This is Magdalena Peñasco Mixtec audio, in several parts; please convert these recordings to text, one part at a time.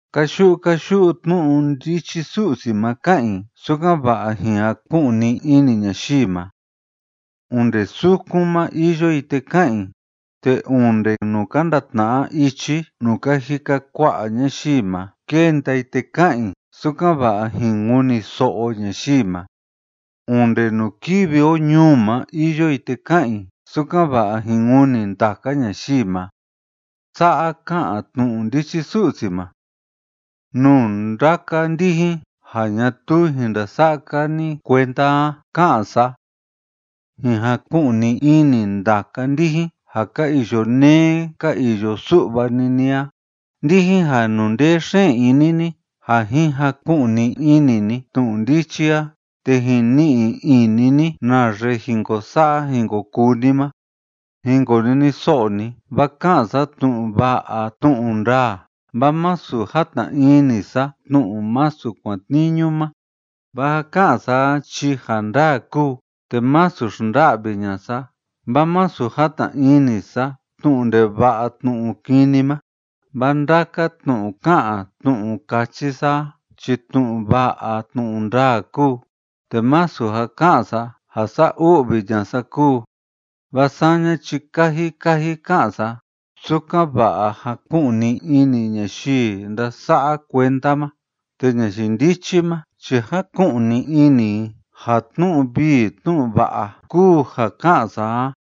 Káyu'u káyu'u tnu'u ndichi Su'si ma ká'an i, sukan‑va'a jin jaku'ni ini ñayii ma. Onde sukun ma iyo i te ká'an i, te onde nuu ka ndatna'a ichi nuu ka jika kua'a ñayii ma kénda i te ká'an i, sukan‑va'a jin kuniso'o ñayii ma. Onde nuu kívi o ñuu ma iyo i te ká'an i, sukan‑va'a jin kuni ndaka ñayii ma. Sa'a ká'an tnu'u ndichi Su'si ma: “Nuu ndaka ndijin ja ñatuu jin ndasa'a‑ka ni kuenda a, ká'an sa: Jin jaku'ni ini ndaka ndijin ja ka iyo neé ka iyo su'va‑ni ni a, ndijin ja inundee xeen ini ni ja jin jaku'ni ini ni tnu'u ndichi a te jin ni'i ini ni naxe jin ko sa'a jin ko kuu ni ma. Jin koniniso'o ni, vaa ká'an sa tnu'u va'a tnu'u ndaa, vaa masu játna ini sa tnu'u masu kuatniñu ma. Vaa ja ká'an sa a chi ja ndaa kúu, te masu xnda'vi ña'a sa, vaa masu játna ini sa tnu'u ndeva'a tnu'u kini ma. Vaa ndaka tnu'u ká'an tnu'u káchi sa a chi tnu'u va'a tnu'u ndaa kúu, te masu ja ká'an sa ja sa'a u'vi ña'a sa kúu, vaa saña chi kaji kaji ká'an sa, sukan‑va'a jaku'ni ini ñayii ndása'a kuenda ma, te ñayii ndichi ma chi jáku'ni ini i ja tnu'u vii tnu'u va'a kúu ja ká'an sa a.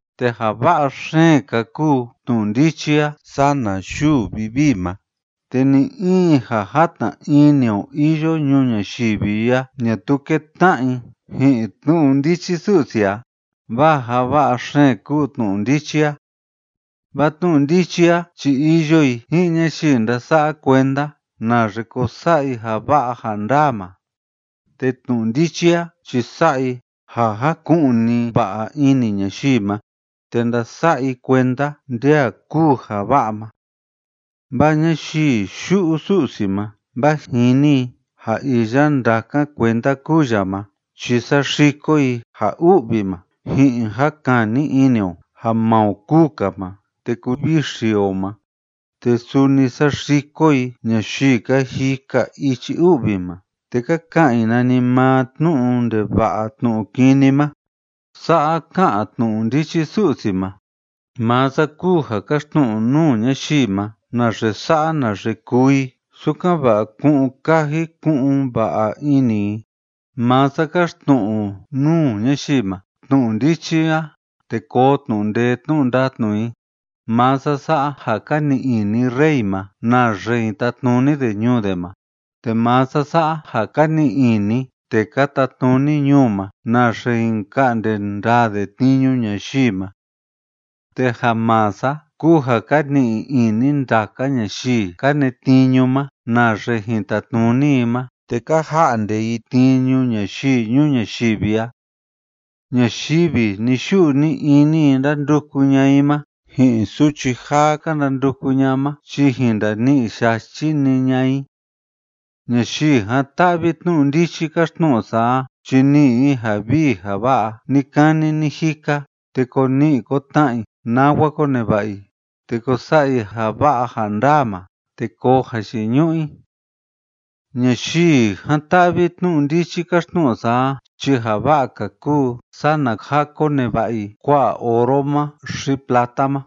Te ja va'a xeen‑ka kúu tnu'u ndichi a sana yuu vivii ma, te ni‑in ja játna ini o iyo ñuu ñayivi a ñatuu kétna'a i ji'in tnu'u ndichi Su'si a, vaa ja va'a xeen kúu tnu'u ndichi a. Vaa tnu'u ndichi a chi iyo i ji'in ñayii ndása'a kuenda naxe ko sa'a i ja va'a ja ndaa ma, te tnu'u ndichi a chi sa'a i ja jaku'ni va'a ini ñayii ma te ndasa'a i kuenda nde a kúu ja va'a ma. Vaa ñayii yu'u Su'si ma vaa jini i ja iya ndákan kuenda kúu ya ma chi saxiko i ja u'vi ma ji'in ja kani ini o ja maa o kúu‑ka ma te kuvixi o ma, te suni saxiko i ñayii ka jika ichi u'vi ma te ka ka'an i nanimaa tnu'u ndeva'a tnu'u kini ma. Sa'a ká'an tnu'u ndichi Su'si ma. “Maa sa kúu ja káxtnu'u nuu ñayii ma naxe sa'a naxe kuu i, sukan‑va'a ku'un kaji ku'un va'a ini i. Maa sa káxtnu'u nuu ñayii ma tnu'u ndichi a, te koo tnu'u ndee tnu'u ndatnu i. Maa sa sa'a ja ka ni'i ini rey ma naxe jin tatnuni de ñuu de ma, te maa sa sa'a ja ka ni'i ini tee ka tatnuni ñuu ma naxe jin ka'nde ndaa de tniñu ñayii ma. Te ja maa sa kúu ja ka ni'i ini ndaka ñayii ka netniñu ma naxe jin tatnuni i ma te ka ja'nde i tniñu ñayii ñuu ñayivi a. Ñayivi ni‑yu'u ni‑ini i ndánduku ña'a i ma, ji'in suchi jaa ka ndanduku ña'a ma chi jin ndani'i yachi‑ni ña'a i. Ñayii jan‑ta'vi tnu'u ndichi káxtnu'u sa a chi ni'i i ja vii ja va'a ni‑kani ni‑jika, te ko ni'i ko tna'a i nawa ko neva'a i, te ko sa'a i ja va'a ja ndaa ma, te koo jayiñu'u i. Ñayii jan‑ta'vi tnu'u ndichi káxtnu'u sa a chi ja va'a‑ka kúu sana ja koneva'a i kua'a oro ma xi plata ma,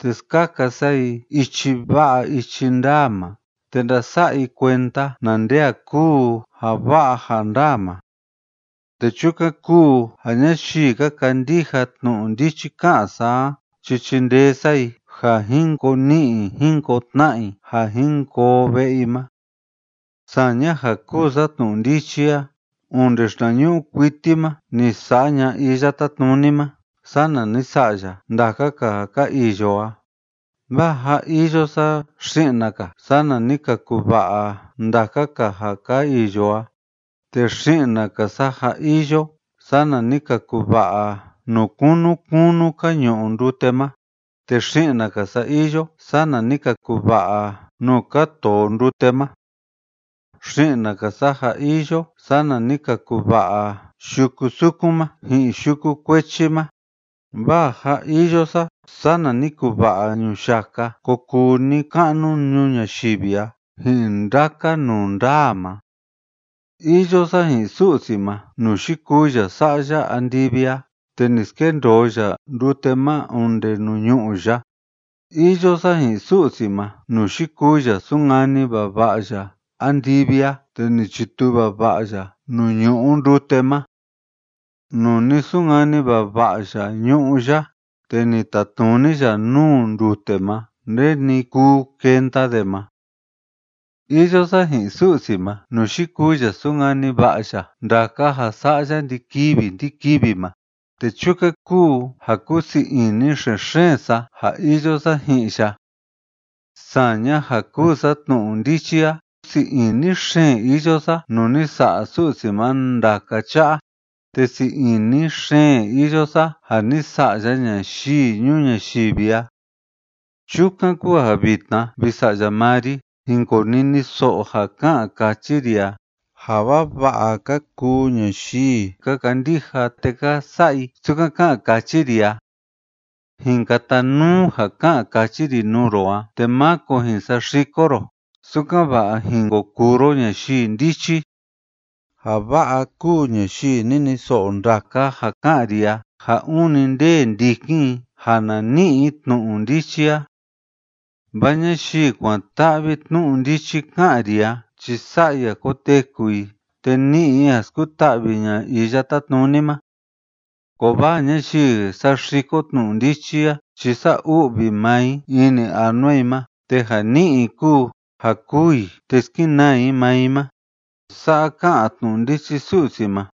te skaka sa i ichi va'a ichi ndaa ma, te ndasa'a i kuenda na nde a kúu ja va'a ja ndaa ma. Te chukan kúu ja ñayii ka kandija tnu'u ndichi ká'an sa a chi chindee sa i ja jin ko ni'i jin ko tna'a i ja jin koo ve'e i ma. ’Saña ja kúu sa tnu'u ndichi a, onde xinañu'u kuiti ma ni sa'a ña'a Iya Tátnuni ma, sana ni sa'a ya ndaka‑ka ja ka iyo a, vaa jâ iyo sa xi'na‑ka, sana ni ka kuva'a ndaka‑ka ja ka iyo a. Te xi'na‑ka sa jâ iyo, sana ni ka kuva'a nuu kunu kunu ka ñu'u ndute ma, te xi'na‑ka sa iyo, sana ni ka kuva'a nuu ka too ndute ma. Xi'na‑ka sa jâ iyo, sana ni ka kuva'a yuku sukun ma ji'in yuku kuechi ma, vaa jâ iyo sa, sana ni kuva'a ñuyaka ko kuu ni‑ka'nu ñuu ñayivi a ji'in ndaka nundaa ma. Iyo sa ji'in Su'si ma nuu yikuu ya sa'a ya andivi a te ni skendoo ya ndute ma onde nuu ñu'ú ya. Iyo sa ji'in Su'si ma nuu yikuu ya sunkani vava'a ya andivi a te ni chituu vava'a ya nuu ñu'u ndute ma. Nuu ni sunkani vava'a ya ñu'ú ya, te ni tatnuni ya nuu ndute ma nde‑ni kuu kenda de ma. Iyo sa ji'in Su'si ma nuu yikuu ya súnkani va'a ya ndaka ja sa'a ya ndi‑kivi ndi‑kivi ma, te chukan kúu ja kúu sii ini xen‑xeen sa ja iyo sa ji'in ya. Saña ja kúu sa tnu'u ndichi a, sii ini xeen iyo sa nuu ni sa'a Su'si ma ndaka cha'a, te sii ini xeen iyo sa ja ni sa'a ya ñayii ñuu ñayivi a. ’Chukan kúu ja vitna, vi sa'ya maa ri, jin koniniso'o ja ká'an káchi ri a. Ja vava'a ka kuu ñayii ka kandija te ka sa'a i sukan ká'an káchi ri a. Jin katanuu ja ká'an káchi ri nuu ro a, te máko jin saxiko ro, sukan‑va'a jin ko kuu ro ñayii ndichi. Ja va'a kúu ñayii niniso'o ndaka ja ká'an ri a, ja ûni ndee ndikin i ja na ni'i i tnu'u ndichi a. Vaa ñayii kuan‑ta'vi tnu'u ndichi ká'an ri a chi sa'a i ja koteku i te ni'i i ja skuta'vi ña'a Iya Tátnuni ma. Kovaa ñayii saxiko tnu'u ndichi a chi sa'a u'vi maa i ini anua i ma, te ja ni'i i kúu ja kûu i te skenaa i maa i ma.” Sa'a ká'an tnu'u ndichi Su'si ma.